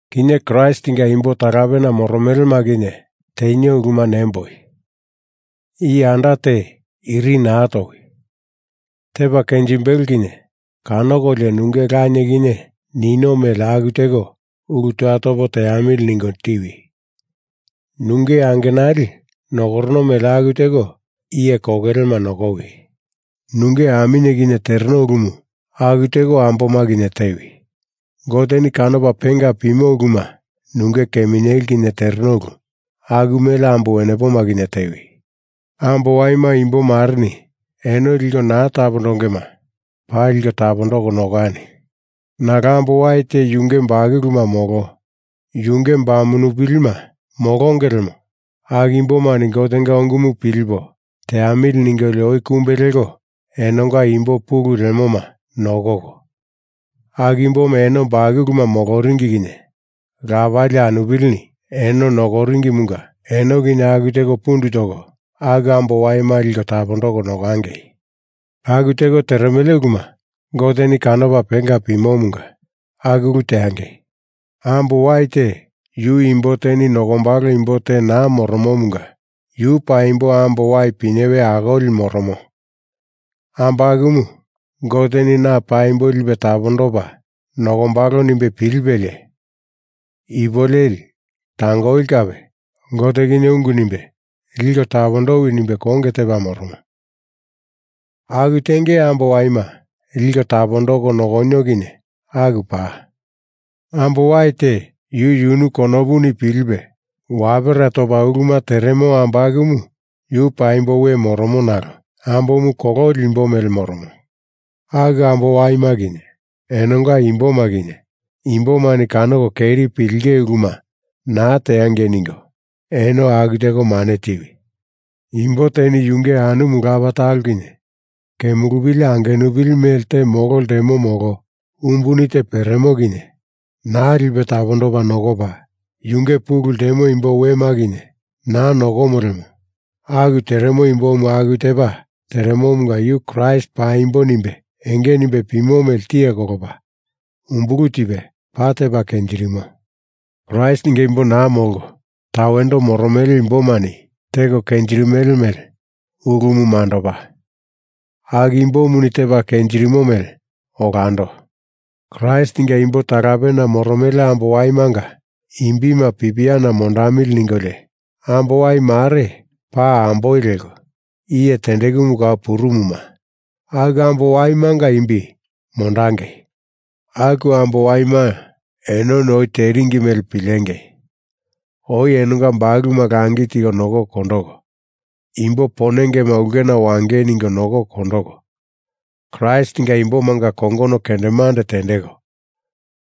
Kinye Kraistinga imbo talapena moromelema kinye tenio uluma nemboi. Iye anda te iri naa towi. Tepa kenjimbelo kinye kanokolio nunge lanie kinye nino mele aku teko ulu toya topo teamili ningo tiwi. Nunge angenali nokorono mele aku teko iye kokelema nokowi. Nunge aminye kinye tereno ulumu aku teko amboma kinye tewi. Goteni kanopa penga pimo uluma nunge keminyeli kinye tereno ulu aku mele ambo wenepoma kinye tewi. Ambo waima imbo mareni eno liko naa tapondongema paa liko tapondoko nokani. Nalo ambo wai te yunge bakuluma molo yunge bamupilima molonge lemo aku imbomani Gotenga ungumu pilipo teamili ningolio oi kumbe leko enonga imbo pulu lemoma nokoko, aku imboma eno bakuluma moloringi kinye lapali anupilini eno nokoringimunga enoni kinye aku teko pundu toko aku ambo waima liko tapondoko nokangei. Aku teko teremele uluma Goteni kanopa penga pimomunga aku ulu teangei. Ambo wai te yu imbo teni nokombalo imbo te naa moromomunga yu paimbo ambo wai pinyewe akoli moromo ambo akumu Goteni na paimbo lipe tapondopa nokombalo nimbe pilipelie ipu leli tangoli kape Gote kinye ungu nimbe liko tapondowi nimbe konge tepa moromo. Aku tenge ambo waima liko tapondoko nokonio kinye aku paa. Ambo wai te yu yunu konopuni pilipe wapera topa uluma teremo ambo akumu yu paimbo we moromo nalo ambomu kololi imbo mele moromo. Aku ambo waima kinye enonga imboma kinye imbomani kanoko keri pilinge uluma naa teangei ningo eno aku teko mane tiwi. Imbo teni yunge anumu lapa talo kinye kemulupili angenupili mele te molo ltemo molo umbuni te peremo kinye naa lipe tapondopa nokopa, yunge pulu ltemo imbo wema kinye naa nokomo lemo aku teremo imbomu aku tepa teremomunga yu Kraist paimbo nimbe enge nimbe pimo mele tiye kolopa umbulu tipe, paa tepa kenjirimo. Kraistinga imbo naa molko tawendo moromele imbomani teko kenjirimele ulumu mandopa, aku imbomuni tepa kenjirimo mele olando. Kraistinga imbo talapena moromele ambo waimanga imbima pipiana mondamili ningolio, ambo wai mare, paa amboi leko, iye tendekumu kau purumuma aku ambo waimanga imbi mondangei. Aku ambo waima enoni oi teringi mele pilengei! Oi enonga bakuluma langi tiko nokoko kondoko, imbo ponengema ulkena wangei ningo nokoko kondoko, Kraistinga imbomanga kongono kendemande tendeko,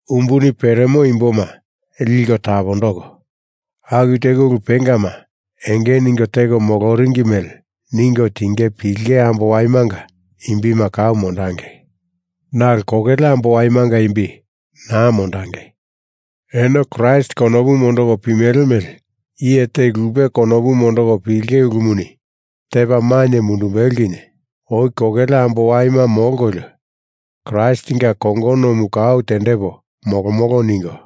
umbuni peremo imboma liko tapondoko, aku teko ulu pengama enge ningo teko moloringi mele ningo tinge pilinge ambo waimanga imbima kau mondangei. Nalo kokele ambo waimanga imbi naa mondangei. Eno Kraist konopu mondoko pimele mele iye te lupe konopu mondoko pilinge ulumuni tepa mainye mundumbelo kinye oi kokele ambo waima molkolio Kraistinga kongonomu kau tendepo molomolo ningo,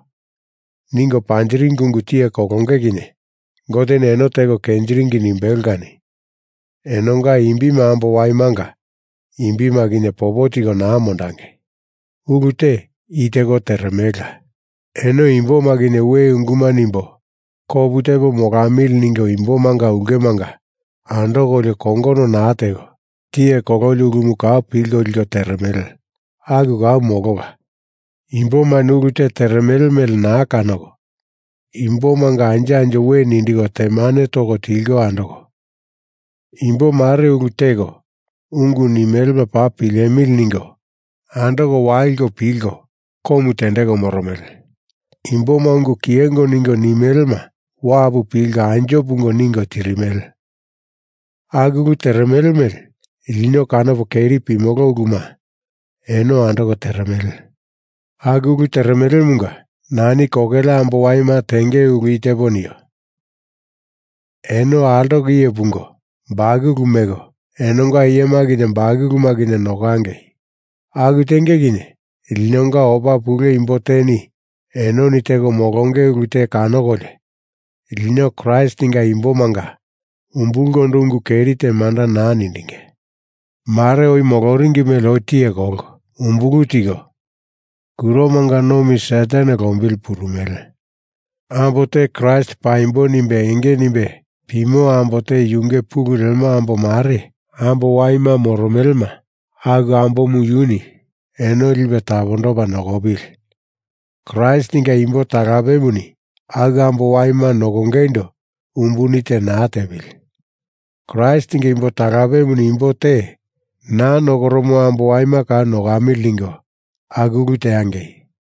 ningo panjiringi ungu tiye kolonge kinye Goteni eno teko kenjiringi nimbelo kani enonga imbima ambo waimanga imbima kinye popo tiko naa mondangei. Ulu te i teko teremelela. Eno imboma kinye we unguma nimbo kopu tepo molamili ningo imbomanga ulkemanga andokolio kongono naa teko tiye kololi ulumu kau pilko liko teremele. Aku kau molola. Imbomani ulu te teremele mele naa kanoko imbomanga anjo anjo we nindiko temane toko tilko andoko, imbo mare ulu teko ungu nimelema paa pilemili ningo andoko waliko pilko komu tendeko moromele. Imboma ungu kiyengo ningo nimelema wapu pilko anjo pungo ningo tirimele. Aku ulu teremele mele lino kanopo keri pimolo uluma eno andoko teremele. Aku ulu teremelemunga nani kokele ambo waima tenge ulu i tepo nio: Eno altoko iye pungo, bakulu meko, enonga iyema kinye bakuluma kinye nokangei. Aku tenge kinye linonga opa pule imbo teni enoni teko molonge ulu te kanokolio lino Kraistinga imbomanga umbulkondo ungu keri te manda naa nindinge. Mare oi moloringi mele oi tiye kolko umbulu tiko kuromanga nomi Satan lombili purumele. Ambo te Kraist paimbo nimbe enge nimbe pimo ambo te yunge pulu lemo ambo mare ambo waima moromelema aku ambomu yuni eno lipe tapondopa nokopili. Kraistinga imbo talapemuni aku ambo waima nokongeindo umbuni te naa tepili. Kraistinga imbo talapemuni imbo te naa nokoromo ambo waima kau nokamili ningo aku ulu teangei.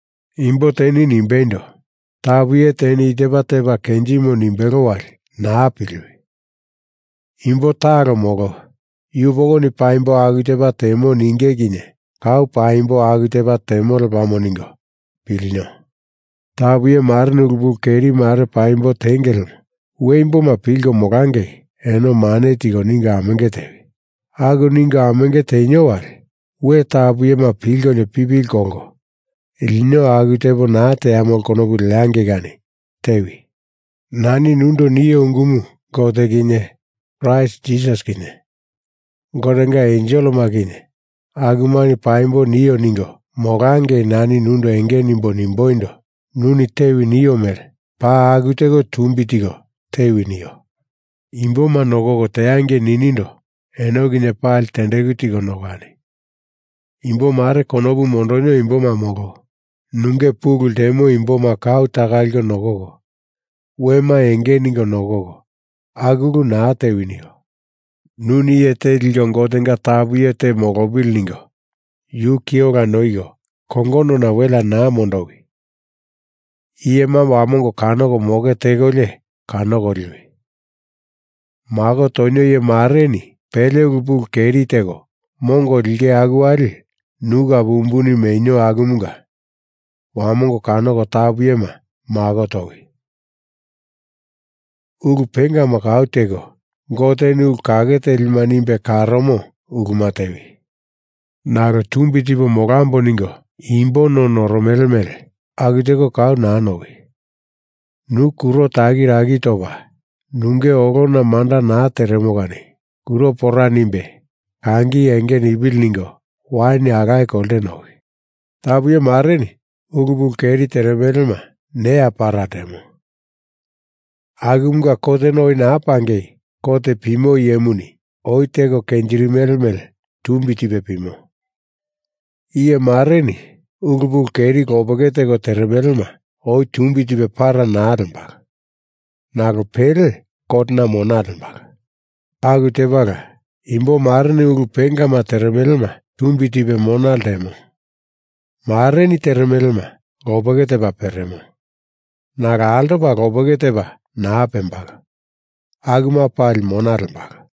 Imbo teni nimbeindo, tapu iye teni i tepa tepa kenjimo nimbelo wali naa piliwi! Imbo talo molo yupokoni paimbo aku tepa temo ninge kinye kau paimbo aku tepa temo lepamo ningo pilinio! Tapu iye mareni ulu pulu keri mare paimbo tenge lemo we imboma pilko molangei eno mane tiko ningo amenge tewi. Aku ningo amenge tenio wali we tapu iyema pilkolio pipili kolko lino aku tepo naa teamolo konopu leangei kani tewi. Nani nundo nio ungumu Gote kinye Kraist Jisasi kinye Gotenga enselema kinye akumani paimbo nio ningo molangei nani nundo enge nimbo nimboindo, nuni tewi nio mele paa aku teko tumbi tiko tewi nio. Imboma nokoko teangei ninindo eno kinye pali tendeku tiko nokani. Imbo mare konopu mondonio imboma molo nunge pulu ltemo imboma kau taka liko nokoko, wema enge ningo nokoko, aku ulu naa tewi nio. Nuni iye te liko Gotenga tapu iye te molopili ningo yu ki ola noiko kongonona welea naa mondowi. Iyema wamongo kanoko moke tekolio kanoko liwi. Mako tonio iye mareni pele ulu pulu keri teko mongo lenge aku wali nu kape umbuni menio akumunga wamongo kanoko tapu iyema mako towi. Ulu pengama kau teko, Goteni ulu kake telima nimbe karomo uluma tewi. Nalo tumbi tipo molambo ningo imbo no norono mele aku teko kau naa nowi. Nu kuro takiraki topa nunge olona manda naa teremo kani kuro pora nimbe kangi enge nipili ningo wain alaye kolte nowi. Tapu iye mareni ulu pulu keri teremelema neya para ltemo akumunga kotena oi naa pangei kot pimo iyemuni oi teko kenjirimele mele tumbi tipe pimo. Iye mareni ulu pulu keri lopeke teko teremelema oi tumbi tipe para naa lembalo nalo pele kotena mona lembalo. Aku tepala, imbo mareni ulu pengama teremelema tumbi tipe mona ltemo mareni teremelema lopeke tepa peremo, nalo altopa lopeke tepa naa pembalo. Akuma pali mona lembalo.